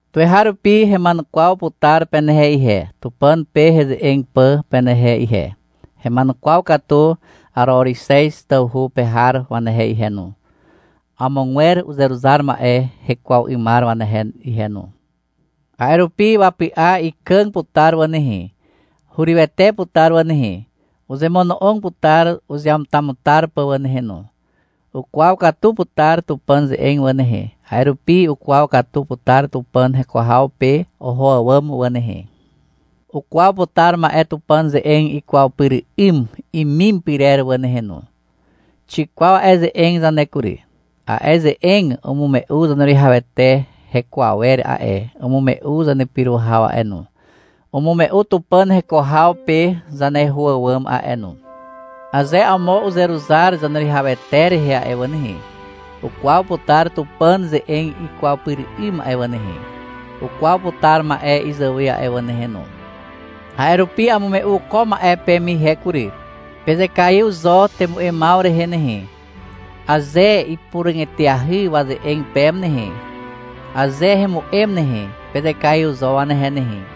Tuweharupi hema'enukwaw putar penehe ihe, Tupàn pe heze'eg pà penehe ihe. Hema'enukwaw Araorixez tawhu pe har wanehe ihe no, amogwer uzeruzar ma'e hekwaw 'ymar wanehe ihe no. A'e rupi wapy'a ikàg putar wà nehe, hurywete putar wà nehe. Uzemono'og putar uzeamutamutar pà wà nehe no. Ukwaw katu putar Tupàn ze'eg wà nehe, a'e rupi ukwaw katu putar Tupàn heko haw pe oho àwàm wà nehe. Ukwaw putar ma'e Tupàn ze'eg ikwaw pyr 'ym imim pyrer wà nehe no. Xikwaw a'e ze'eg zane kury. A'e ze'eg umume'u Zaneruwihawete heko awer a'e, umume'u zanepyro haw a'e no, umume'u Tupàn heko haw pe zaneho àwàm a'e no. Aze amo uzeruzar Zaneruwihawete rehe a'e wà nehe, ukwaw putar Tupàn ze'eg ikwaw pyr 'ym a'e wà nehe, ukwaw putar ma'e izàwe a'e wà nehe no. A'e rupi amume'u ko ma'e peme ihe kury. Pezekaiw zo temu'emaw rehe nehe. Aze ipuràg eteahy waze'eg peme nehe, aze hemu'em nehe, pezekaiw zo wanehe nehe.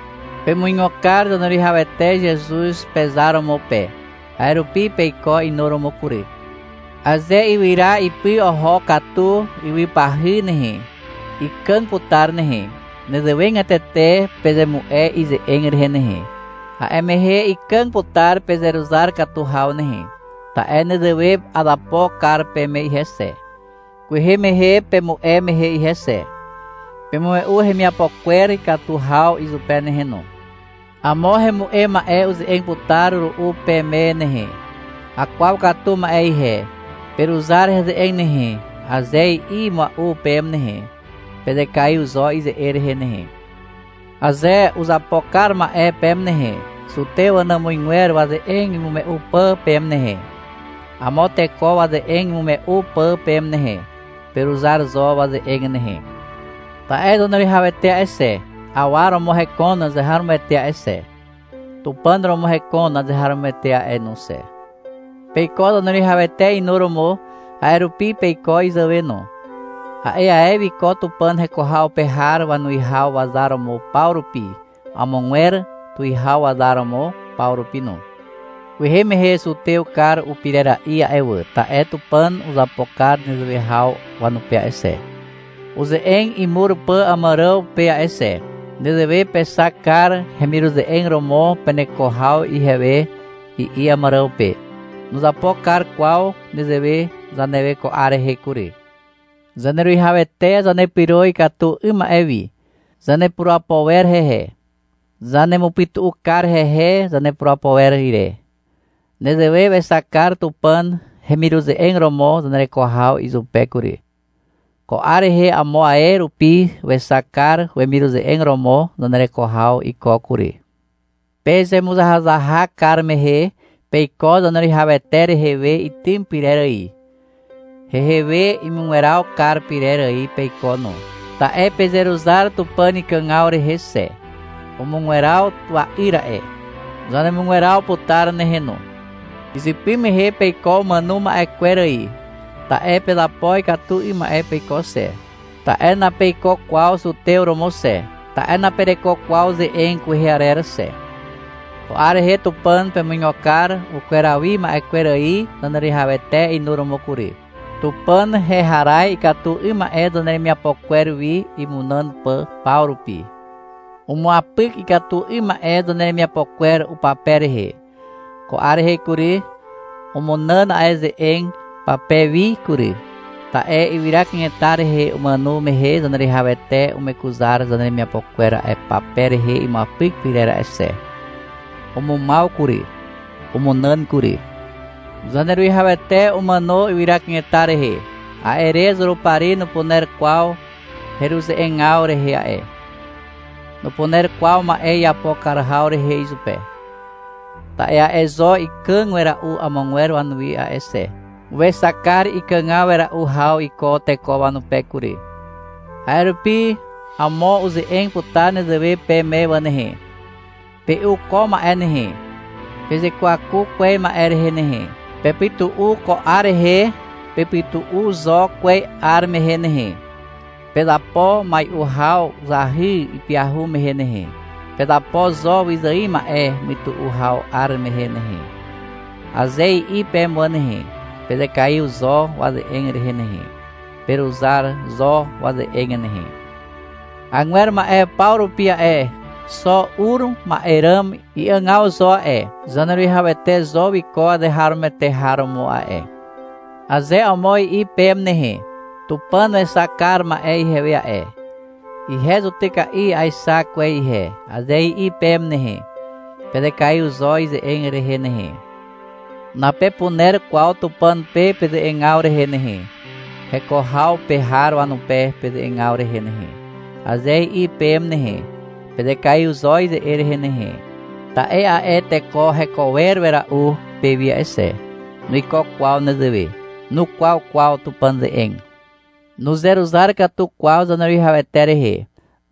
Pemuigo kar Zaneruwihawete Zezuz pezar romo pe. A'e rupi peiko inuromo kury. Aze ywyra ipy oho katu ywypahy nehe, ikàg putar nehe. Nezewegatete pezemu'e ize'eg rehe nehe. A'e mehe ikàg putar pezeruzar katu haw nehe. Ta'e nezewe azapo kar peme ihe xe, kwehe mehe pemu'e mehe ihe xe. Pemume'u hemiapo kwer ikatu haw izupe nehe no. Amo hemu'em ma'e uze'eg putar ru'u peme nehe. — Akwaw katu ma'e ihe, peruzar heze'eg nehe, aze i'i mua'u peme nehe, pezekaiw zo ize'eg rehe nehe. Aze uzapo kar ma'e peme nehe, zutew wanàmuzgwer waze'eg imume'u pà peme nehe, amo teko waze'eg imume'u pà peme nehe, peruzar zo waze'eg nehe. Ta'e Zaneruwihawete a'e xe, awa romo hekon azeharomoete a'e xe, Tupàn romo hekon azeharomoete a'e no xe. Peiko Zaneruwihawete inuromo, a'e rupi peiko izàwe no. A'e ae wiko Tupàn heko haw pe har wanuwihaw wazar romo paw rupi, amogwer tuwihaw wazar romo paw rupi no. Kwehe mehe zutew kar upirera'i a'e wà, ta'e Tupàn uzapo kar nezewe haw wanupe a'e xe, uze'eg imur pà Àmàràw pe a'e xe. Nezewe pexak kar heremiruze'eg romo peneko haw ihewe, i'i Àmàràw pe. Nuzapo kar kwaw nezewe zanewe ko 'ar rehe kury. Zaneruwihawete zanepyro ikatu 'ym ma'e wi. Zanepurapo wer hehe. Zanemupytu'u kar hehe zanepurapo wer ire. Nezewe wexak kar Tupàn hemiruze'eg romo zanereko haw izupe kury. Ko 'ar rehe amo ae rupi wexak kar wemiruze'eg romo zanereko haw iko kury. Pezemuzahazahak kar mehe peiko Zaneruwihawete rehe we itym pyrer ài. Hehe we imugweraw kar pyrer ài peiko no, ta'e pezeruzar Tupàn ikàgaw rehe xe. Umugweraw wa'yr a'e. Zanemugweraw putar nehe no. Izypy mehe peiko umàno ma'e kwer ài, ta'e pezapo ikatu 'ym ma'e peiko xe, ta'e napeiko kwaw zutew romo xe, ta'e napereko kwaw ze'eg kwehe arer xe. Ko 'ar rehe Tupàn pemuigo kar ukweraw wi ma'e kwer ài Zaneruwihawete inuromo kury. Tupàn heharaz ikatu 'ym ma'e zaneremiapo kwer wi, imunàn pà paw rupi. Umuapyk ikatu 'ym ma'e zaneremiapo kwer upape rehe. Ko 'ar rehe kury, umunàn a'e ze'eg pape wi kury. Ta'e ywyra kanetar rehe umàno mehe Zaneruwihawete umekuzar zaneremiapo kwer a'e pape rehe imuapyk pyrer a'e xe. Umumaw kury. Umunàn kury. Zaneruwihawete umàno ywyra kanetar rehe. A'e re Zurupari nupuner kwaw heruze'egaw rehe a'e. Nupuner kwaw ma'e iapo kar haw rehe izupe. Ta'e a'e zo ikàg wera'u amogwer wanuwi a'e xe. Wexak kar ikàg wera'u haw iko teko wanupe kury. A'e rupi amo uze'eg putar nezewe peme wà nehe. — Pe'u ko ma'e nehe, pezekwaku kwez ma'e rehe nehe, pepytu'u ko 'ar rehe, pepytu'u zo kwez 'ar mehe nehe, pezapo mai'u haw zahy ipyahu mehe nehe, pezapo zo wyzài ma'e mytu'u haw 'ar mehe nehe, aze i'i peme wà nehe, pezekaiw zo waze'eg rehe nehe. Peruzar zo waze'eg nehe. Agwer ma'e paw rupi a'e, xo ur ma'e ràm i'àgaw zo a'e, Zaneruwihawete zo wiko azeharomoete har romo a'e. Aze amo i'i peme nehe. — Tupàn wexak kar ma'e ihewe a'e, ihe zutyka'i aexak kwez ihe, aze i'i peme nehe, pezekaiw zo ize'eg rehe nehe. — Napepuner kwaw Tupàn pe peze'egaw rehe nehe, heko haw pe har wanupe peze'egaw rehe nehe, aze i'i peme nehe, pezekaiw zo ize'eg rehe nehe. Ta'e a'e teko heko wer wera'u pewi a'e xe. Nuiko kwaw nezewe. Nukwaw kwaw Tupàn ze'eg. Nuzeruzar katu kwaw Zaneruwihawete rehe.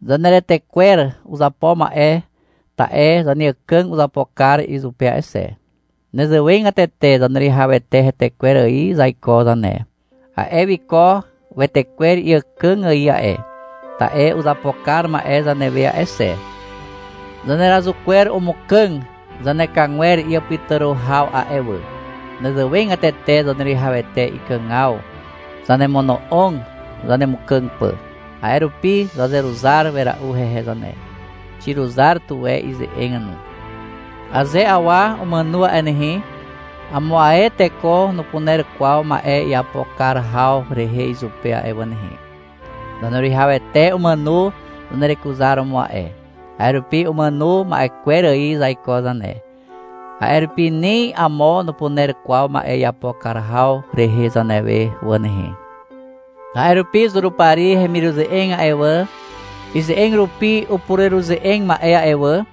Zaneretekwer uzapo ma'e ta'e zaneàkàg uzapo kar izupe a'e xe. Nezewegatete Zaneruwihawete hetekwer ài zaiko zane. A'e wiko wetekwer iàkàg ài a'e, ta'e uzapo kar ma'e zanewe a'e xe. Zanerazuk kwer umukàg zanekagwer iàpytàro haw a'e wà. Nezewegatete Zaneruwihawete ikàgaw zanemono'og zanemukàg pà. A'e rupi zazeruzar wera'u hehe zane. Xiruzar tuwe ize'eg no. Aze awa umàno a'e nehe, amo ae teko nupuner kwaw ma'e iapo kar haw rehe izupe a'e wà nehe. Zaneruwihawete umàno zanerekuzaromo a'e. A'e rupi umàno ma'e kwer ài zaiko zane. A'e rupi ni amo nupuner kwaw ma'e iapo kar haw rehe zanewe wà nehe. A'e rupi Zurupari hemiruze'eg a'e wà, ize'eg rupi upureruze'eg ma'e a'e wà,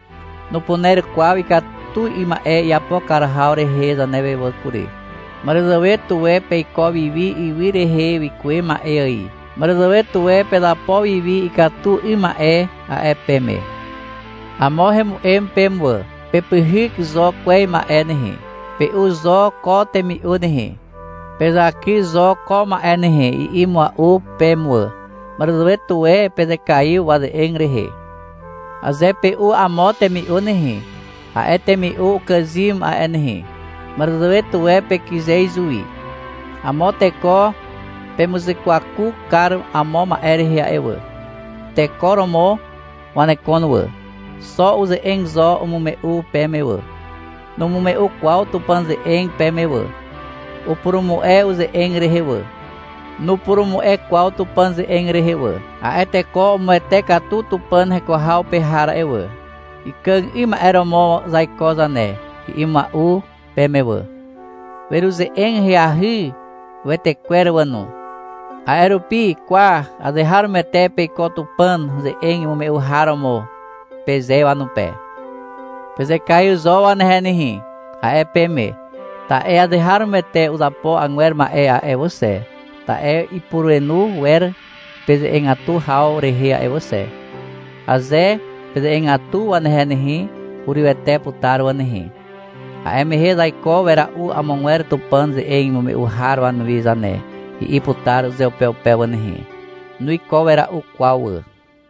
nupuner kwaw ikatu 'ym ma'e iapo kar haw rehe zanewe wà kury. — Màràzàwe tuwe peiko wiwi ywy rehe wikuwe ma'e ài. Màràzàwe tuwe pezapo wiwi ikatu 'ym ma'e, a'e peme. Amo hemu'em peme wà. — Pepyhyk zo kwez ma'e nehe, pe'u zo ko temi'u nehe, pezaky zo ko ma'e nehe, i'i mua'u peme wà. Màràzàwe tuwe pezekaiw waze'eg rehe. Aze pe'u amo temi'u nehe, a'e temi'u ukàzym a'e nehe. Màràzàwe tuwe pekyze izuwi. Amo teko pemuzekwaku kar amo ma'e rehe a'e wà. Teko romo wanekon wà. Xo uze'eg zo umume'u peme wà. Numume'u kwaw Tupàn ze'eg peme wà. Upurumu'e uze'eg rehe wà. Nupurumu'e kwaw Tupàn ze'eg rehe wà. A'e teko umuwete katu Tupàn heko haw pe har a'e wà. — Ikàg 'ym ma'e romo zaiko zane, i'i mua'u peme wà. Weruze'eg ahyahy wetekwer wà no. A'e rupi — Kwa, azeharomoete peiko Tupàn ze'eg imume'u har romo, peze wanupe. — Pezekaiw zo wanehe nehe, a'e peme, ta'e azeharomoete uzapo agwer ma'e a'e wà xe, ta'e ipurenu wer peze'egatu haw rehe a'e wà xe. Aze peze'egatu wanehe nehe, hurywete putar wà nehe. A'e mehe — Zaiko wera'u amogwer Tupàn ze'eg imume'u har wanuwi zane, i'i putar uzeupeupe wà nehe. Nuiko wera'u kwaw wà.